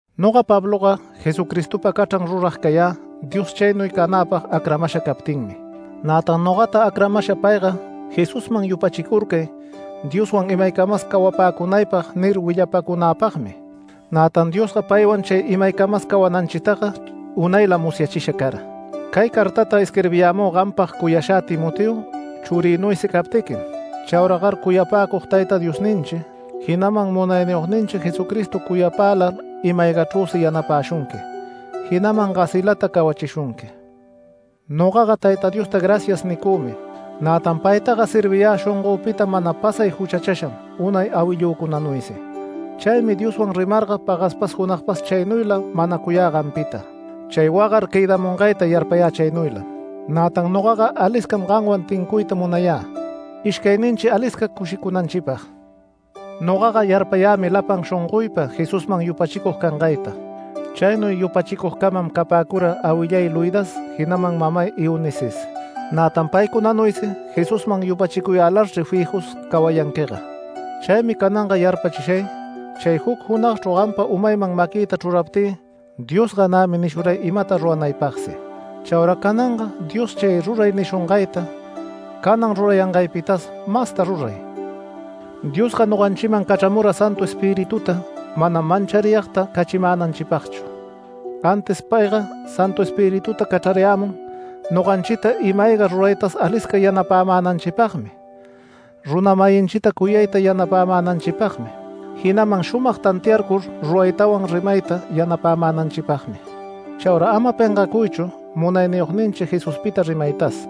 Noga Pabloga Jesucristopa cachran rurag cayä, Dios chaynuy canäpag acramasha captinmi. Nätan nogata acramasha payga “Jesusman yupachicurcay Dioswan imaycamas cawapäcunaypag” nir willapacunäpagmi. Nätan Diosga paywan chay imaycamas cawananchitaga unaylam musyachisha cara. Cay cartata isquirbiyämü gampag cuyashä Timoteo, churïnuysi captiquim. Chauragar cuyapäcug Tayta Diosninchi, jinaman Munayniyogninchi Jesucristo cuyapälar ima-aygachrüsi yanapäshunqui, jinaman gasilata cawachishunqui. Nogaga Tayta Diosta “Gracias” nicümi. Nätan paytaga serviyä shongöpita mana pasay juchachasham unay awillücunanuysi. Chaymi Dioswan rimarga pagaspas junagpas chaynuyla manacuyä gampita. Chay wagar quëdamungayta yarpayä chaynuylam. Nätan nogaga aliscam gamwan tincuyta munayä, ishcayninchi alisca cushicunanchipag. Nogaga yarpayämi lapan shongoypa Jesusman yupachicug cangayta. Chaynuy yupachicugcamam capäcura awillay Loidas jinaman mamay Eunices. Nätan paycunanuysi Jesusman yupachicuyälarchri fijus cawayanquiga. Chaymi cananga yarpachishay, chay juc junagchru gampa umayman maquïta chruraptï Diosga nämi nishuray imata ruranaypagsi. Chaura cananga Dios chay ruray nishungayta, canan rurayangaypitas masta ruray. Diosga noganchiman cachramura Santu Espirituta manam manchariyagta cachimänanchipagchu. Antis payga Santu Espirituta cachrarayämun noganchita ima-ayga ruraytas alisca yanapämänanchipagmi, runa-mayinchi cuyayta yanapämänanchipagmi, jinaman shumag tantiarcur ruraytawan rimayta yanapämänanchipagmi. Chaura ama pengacuychu Munayniyogninchi Jesuspita rimaytas,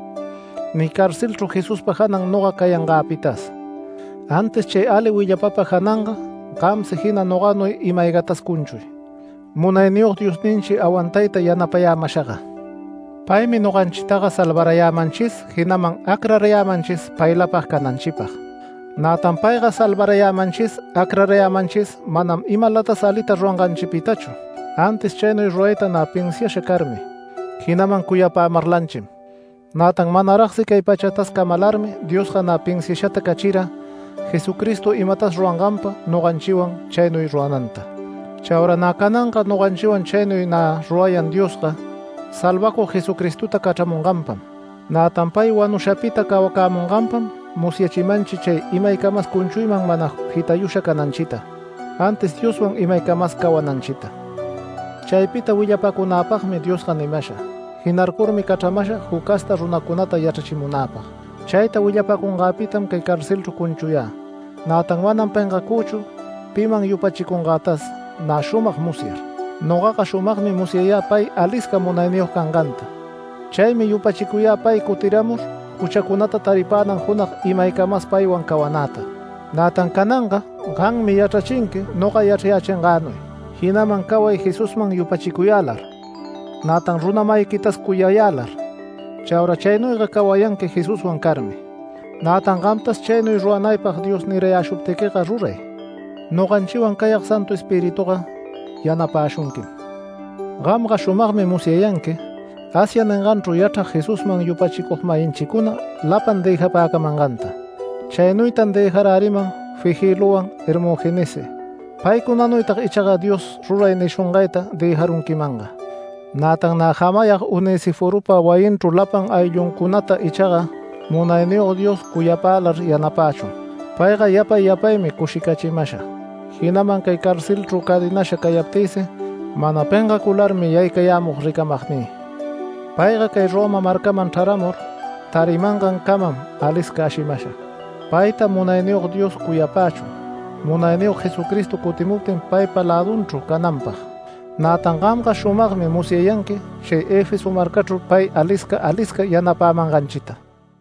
ni carcelchru Jesuspa janan noga cayangäpitas, antis chay ali willapapa jananga gamsi jina noganuy ima-aygatas cunchuy, Munayniyog Diosninchi awantayta yanapayämashaga. Paymi noganchitaga salvarayämanchis, jinaman acrarayämanchis paylapag cananchipag. Nätan payga salvarayämanchis, acrayämanchis manam imalatas alita ruranganchipitachu, antis chaynuy rurayta nä pinsiasha carmi, jinaman cuyapämarlanchim. Nätan manaragsi cay pachatas camalarmi Diosga nä pinsiashata cachira Jesucristo imatas ruranganpa noganchiwan chaynuy rurananta. Chaura nä cananga noganchiwan chaynuy nä rurayan Diosga Salvacug Jesucristota cachramunganpam. Nätan pay wanushapita cawacämunganpam musyachimanchi chay imaycamas cunchuyman mana jitayusha cananchita, antis Dioswan imaycamas cawananchita. Chaypita willapacunäpagmi Diosga nimasha. Jinarcurmi cachramasha juc casta runacunata yachrachimunäpag. Chayta willapacungäpitam cay carcelchru cunchuyä, nätan manam pengacüchu piman yupachicuyangätas nä shumag musyar. Nogaga shumagmi musyayä pay alisca munayniyog canganta. Chaymi yupachicuyä pay cutiramur juchacunata taripänan junag imaycamas paywan cawanäta. Nätan cananga gammi yachrachinqui noga yachrayächingänuy, jinaman caway Jesusman yupachicuyälar, nätan runa-mayiquitas cuyayälar. Chaura chaynuyga cawayanqui Jesuswan carmi. Nätan gamtas chaynuy ruranaypag Dios nirayäshuptiquiga ruray, noganchiwan cayag Santu Espirituga yanapäshunquim. Gamga shumagmi musyayanqui Asia ninganchru yachrag Jesusman yupachicug-mayinchicuna lapan dëjapäcamanganta. Chaynuytan dëjaräriman Figelowan Hermogenessi. Paycunanuytag ichaga Dios ruray nishungayta dëjarunquimanga. Nätan nä jamayag Onesiforopa wayinchru lapan aylluncunata ichaga Munayniyog Dios cuyapälar yanapächun. Payga yapay yapaymi cushicachimasha, jinaman cay carcelchru cadenasha cayaptïsi mana pengacularmi yaycayämug ricamagnï. Payga cay Roma marcaman chraramur, tarimangancamam alisca ashimasha. Payta Munayniyog Dios cuyapächun, Munayniyog Jesucristo cutimuptin paypa lädunchru cananpag. Nätan gamga shumagmi musyayanqui chay Efeso marcachru pay alisca alisca yanapämanganchita.